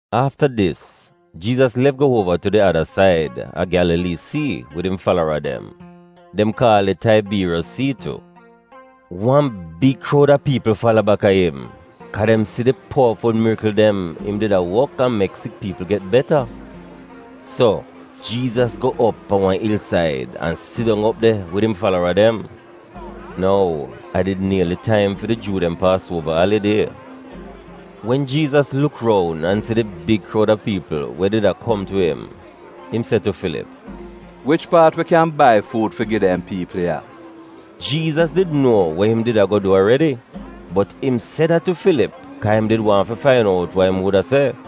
Afta dis, Jiizas lef go uova tu di ada said a Gyalalii Sii wid im falara dem. (Dem kaal it Taibiiriyos Sii tu.) Wan big kroud a piipl fala baka im, kaa dem si di powaful mirikl dem im did a wok an mek sik piipl get beta. So, Jiizas go op pan wan ilsaid an sit dong op de wid im falara dem. (Nou, a did nieli taim fi di Juu dem Paasuova alidie.) Wen Jiizas luk roun an si di big kroud a piipl we did a kom tu im, im se tu Filip, “Wich paat wi kyan bai fuud fi gi dem piipl ya?” (Jiizas did nuo we im did ago du aredi, bot im se dat tu Filip kaa im did wan fi fain out wa im wuda se.)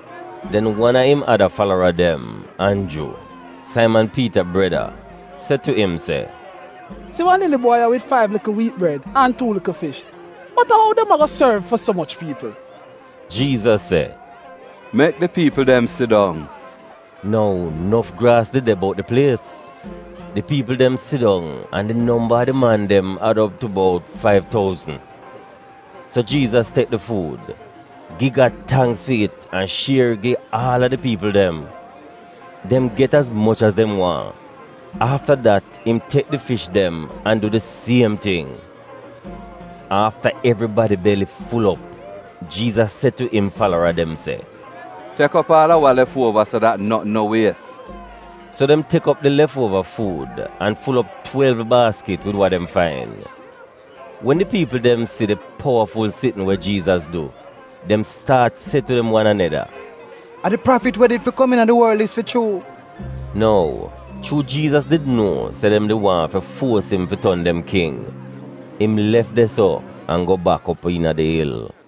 Den wan a im ada falara dem, Anju, Saiman Piita breda, se tu im se, “Si wan lili bwai ya wid faiv likl wiit bred an tuu likl fish, bot a ou dem ago sorv fi so moch piipl?” Jiizas se, “Mek di piipl dem sidong.” (Nou nof graas did de bout di plies.) Di piipl dem sidong an di nomba a di man dem ad op tu bout faiv touzn. So Jiizas tek di fuud, gi Gad tangks fi it an shier gi aal a di piipl dem. Dem get az moch az dem waahn. Afta dat, im tek di fish dem an du di siem ting. Afta evribadi beli ful op, Jiizas se tu im falara dem se, “Tek op aal a wa lef uova, so dat notn no wies.” So dem tek op di lef uova fuud an ful op twelv baaskit wid wa dem fain. Wen di piipl dem si di powaful sitn we Jiizas du, dem staat se tu dem wan aneda, “A di Prafit we did fi kom iina di worl dis fi chuu!” Nou, chuu Jiizas did nuo se dem did waahn fi fuos im fi ton dem king, im lef de-so an go bak op iina di il.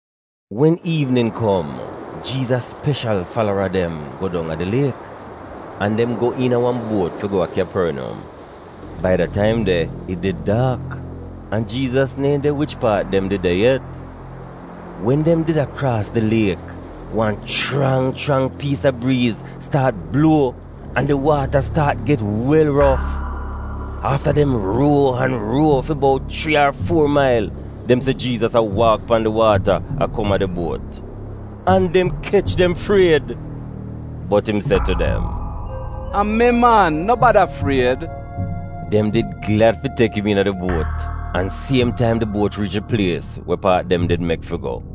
Wen iivnin kom, Jiizas speshal falara dem go dong a di liek, an dem go iina wan buot fi go a Kyaporniyom. (Bai da taim de, it did daak, an Jiizas neehn de wich paat dem did de yet.) Wen dem did a kraas di liek, wan chrang chrang piis a briiz staat bluo an di waata staat get wel rof. Afta dem ruo an ruo fi bout chrii ar fuo mail, dem si Jiizas a waak pan di waata a kom a di buot. An dem kech dem fried! Bot im se tu dem, “A mi, man! No bada fried!” Dem did glad fi tek im iina di buot an siem taim di buot riich di plies we paat dem did mek fi go.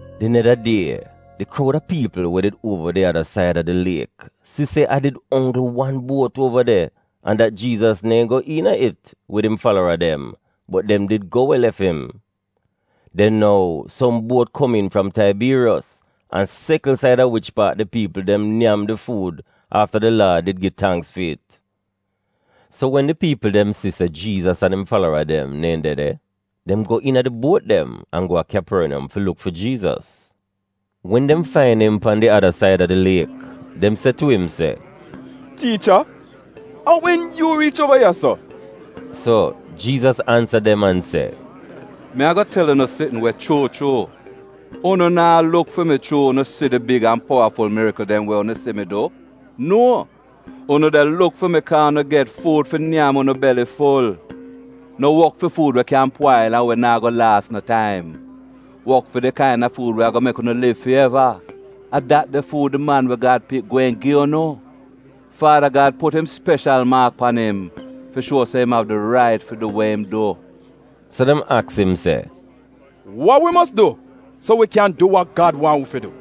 Di neda die, di kroud a piipl we did uova di ada said a di liek si se a did onggl wan buot uova de an dat Jiizas neehn go iina it wid im falara dem, bot dem did go we lef im. Den nou, som buot komiin fram Taibiiriyos an sekl saida wich paat di piipl dem nyam di fuud afta di Laad did gi tangks fi it. So, wen di piipl dem si se Jiizas an im falara dem neehn de de, dem go iina di buot dem an go a Kyaporniyom fi luk fi Jiizas. Wen dem fain im pan di ada said a di liek, dem se tu im se, “Tiicha, a wen yu riich uova ya-so?” So, Jiizas ansa dem an se, “Mi ago tel unu sitn we chuu chuu: unu naa luk fi mi chuu unu si di big an powaful mirikl dem we unu si mi du. Nuo! Unu de luk fi mi kaa unu get fuud fi nyam unu beli ful. No wok fi fuud we kyan pwail an we naa go laas no taim. Wok fi di kaina fuud we ago mek unu liv fi eva, a dat de fuud di Man we Gad Pik gweehn gi unu. Faada Gad put im speshal maak pan im fi shuo se im av di rait fi du we im du.” So, dem aks im se, “Wa wi mos du, so wi kyan du wa Gad waahn wi fi du?”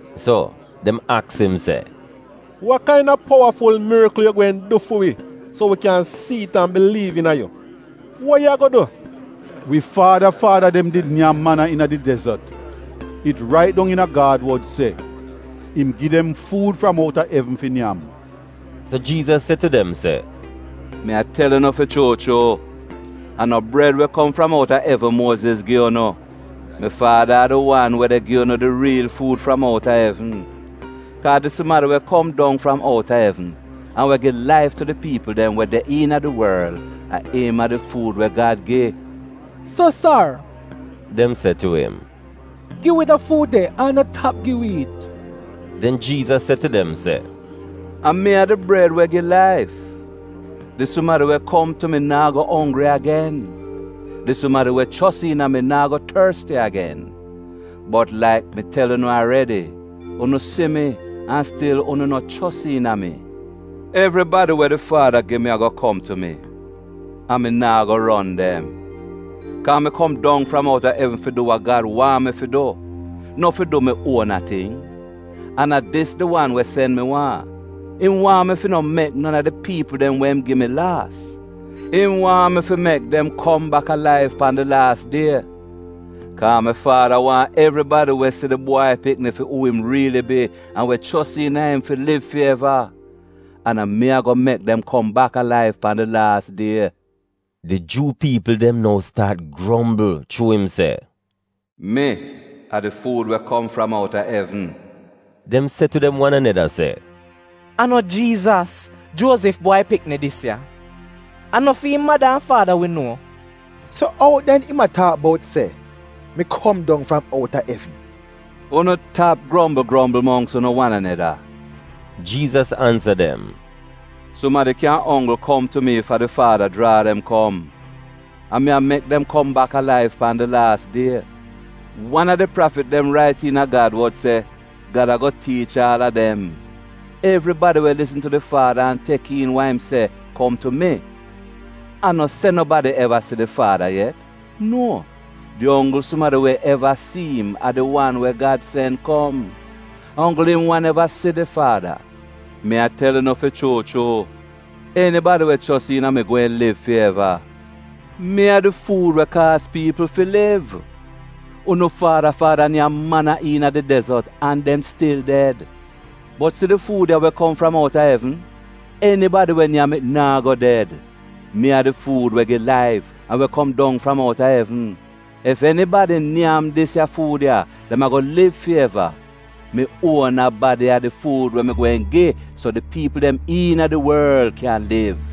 So, dem aks im se, “Wa kaina powaful mirikl yu gweehn du fi wi so wi kyan si'it an biliiv iina yu? Wa yu ago du? Wi faada faada dem did nyam mana iina di dezot. It rait dong iina Gad wod se, ‘Im gi dem fuud fram outa evn fi nyam.’” So Jiizas se tu dem se, “Mi a tel unu fi chuu chuu: a no bred we kom fram outa evn Muoziz gi unu. Mi Faada a di wan we de gi unu di riil fuud fram outa evn. Kaa, di sumadi we kom dong fram outa evn an we gi laif tu di piipl dem we de iina di worl a im a di fuud we Gad gi.” “So, sar,” dem se tu im, “gi wi da fuud de an no tap gi wi it.” Den Jiizas se tu dem se, “A mi a di bred we gi laif. Di sumadi we kom tu mi naa go onggri agen. Di sumadi we chos iina mi naa go torsti agen. Bot, laik mi tel unu aredi, unu si mi an stil unu no chos iina mi. Evribadi we di Faada gi mi ago kom tu mi, an mi naa go ron dem. Kaa mi kom dong fram outa evn fi du wa Gad waahn mi fi du, no fi du mi uona ting. An a dis di wan we sen mi waahn: im waahn mi fi no mek non a di piipl dem we im gi mi laas; im waahn mi fi mek dem kom bak alaiv pan di laas die. Kaa mi Faada waahn evribadi we si di Bwai Pikni fi uu im riili bi an we chos iina im fi liv fi eva, an a mi ago mek dem kom bak alaiv pan di laas die.” Di Juu piipl dem nou staat grombl chuu im se, “Mi a di fuud we kom fram outa evn.” Dem se tu dem wan aneda se, “A no Jiizas, Juozif bwai pikni, dis ya? A no fi'im mada an faada wi nuo? So ou den im a taak bout se, ‘Mi kom dong fram outa evn’?” “Unu tap grombl grombl mongks unu wan aneda,” Jiizas ansa dem. “Sumadi kyan onggl kom tu mi ef a di Faada jraa dem kom, an mi a mek dem kom bak alaiv pan di laas die. Wan a di prafit dem rait iina Gad wod se, ‘Gad ago tiich aal a dem.’ Evribadi we lisn tu di Faada an tek iin wa im se kom tu mi. A no se nobadi eva si di Faada yet. Nuo! Di onggl sumadi we eva si'im a di wan we Gad sen kom. A onggl im wan eva si di Faada. Mi a tel unu fi chuu chuu: enibadi we chos iina mi gweehn liv fi eva. Mi a di fuud we kaaz piipl fi liv. Unu faada faada nyam mana iina di dezot, an dem stil ded. Bot si di fuud ya we kom fram outa evn! Enibadi we nyam it naa go ded. Mi a di fuud we gi laif, an we kom dong fram outa evn. Ef enibadi nyam dis ya fuud ya, dem ago liv fi eva. Mi uona badi a di fuud we mi gweehn gi so di piipl dem iina di worl kyan liv.”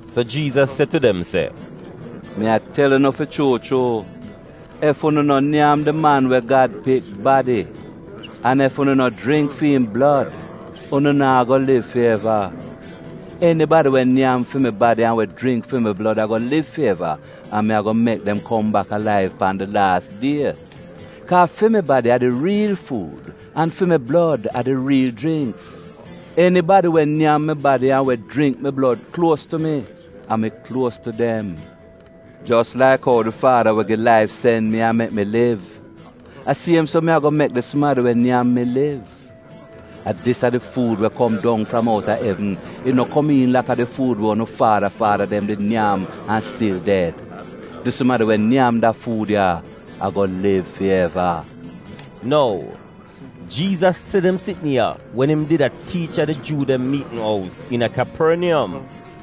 So Jiizas se tu dem se, “Mi a tel unu fi chuu chuu: ef unu no nyam di Man we Gad Pik badi an ef unu no jringk fi'im blod, unu naa go liv fi eva. Enibadi we nyam fi mi badi an we jringk fi mi blod ago liv fi eva, an mi ago mek dem kom bak alaiv pan di laas die. Kaa fi mi badi a di riil fuud an fi mi blod a di riil jringks. Enibadi we nyam mi badi an we jringk mi blod kluos tu mi, an mi kluos tu dem. Jos laik ou di Faada we gi laif sen mi an mek mi liv, a siem so mi ago mek di sumadi we nyam mi liv. A dis a di fuud we kom dong fram outa evn. It no komiin laka di fuud we unu faada faada dem did nyam an stil ded. Di sumadi we nyam da fuud ya ago liv fi eva.” Nou, Jiizas se dem sitn ya wen im did a tiich a di Juu dem miitn ous iina Kyaporniyom.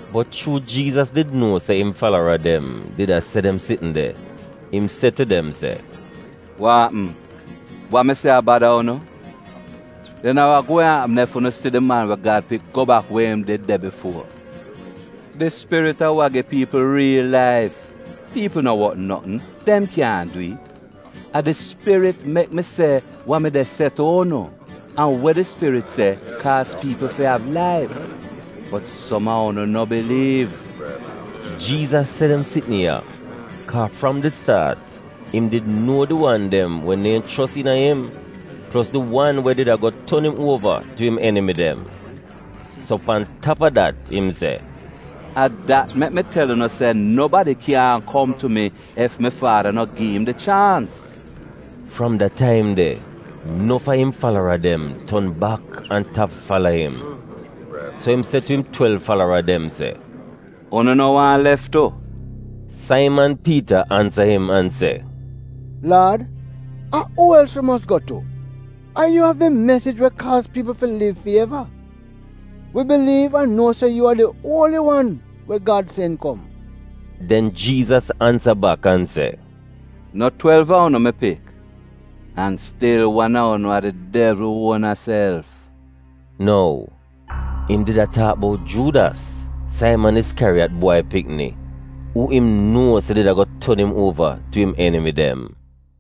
Bot chuu Jiizas did nuo se im falara dem did a se dem sitn de, im se tu dem se, “Wa apm, wa mi se a bada unu? Den a wa gweehn apm ef unu si di Man we Gad Pik go bak we im did de bifuo! Di Spirit a wa gi piipl riil laif. Piipl no wot notn; dem kyaahn dwi'it. A di Spirit mek mi se wa mi de se tu unu, an we di Spirit se kaaz piipl fi av laif. Bot, som a unu no biliiv.” (Jiizas se dem sitn ya, kaa fram di staat, im did nuo di wan dem we neehn chos iina im, plos di wan we did a go ton im uova tu im enimi dem.) So pan tap a dat im se, “A dat mek mi tel unu se nobadi kyaahn kom tu mi ef mi Faada no gi'im di chaans.” Fram da taim de, nof a im falara dem ton bak an tap fala im. So im se tu im twelv falara dem se, “Unu no waahn lef tu?” Saiman Piita ansa im an se, “Laad, a uu els wi mos go tu? A yu av di mesij we kaaz piipl fi liv fi eva. Wi biliiv an nuo se yu a di Uoli Wan we Gad sen kom.” Den Jiizas ansa bak an se, “No twelv a unu mi pik? An stil wan a unu a di devl uona self.” (Nou, im did a taak bout Juudas, Saiman Iskyariyat bwai pikni, uu im nuo se did ago ton im uova tu im enimi dem.)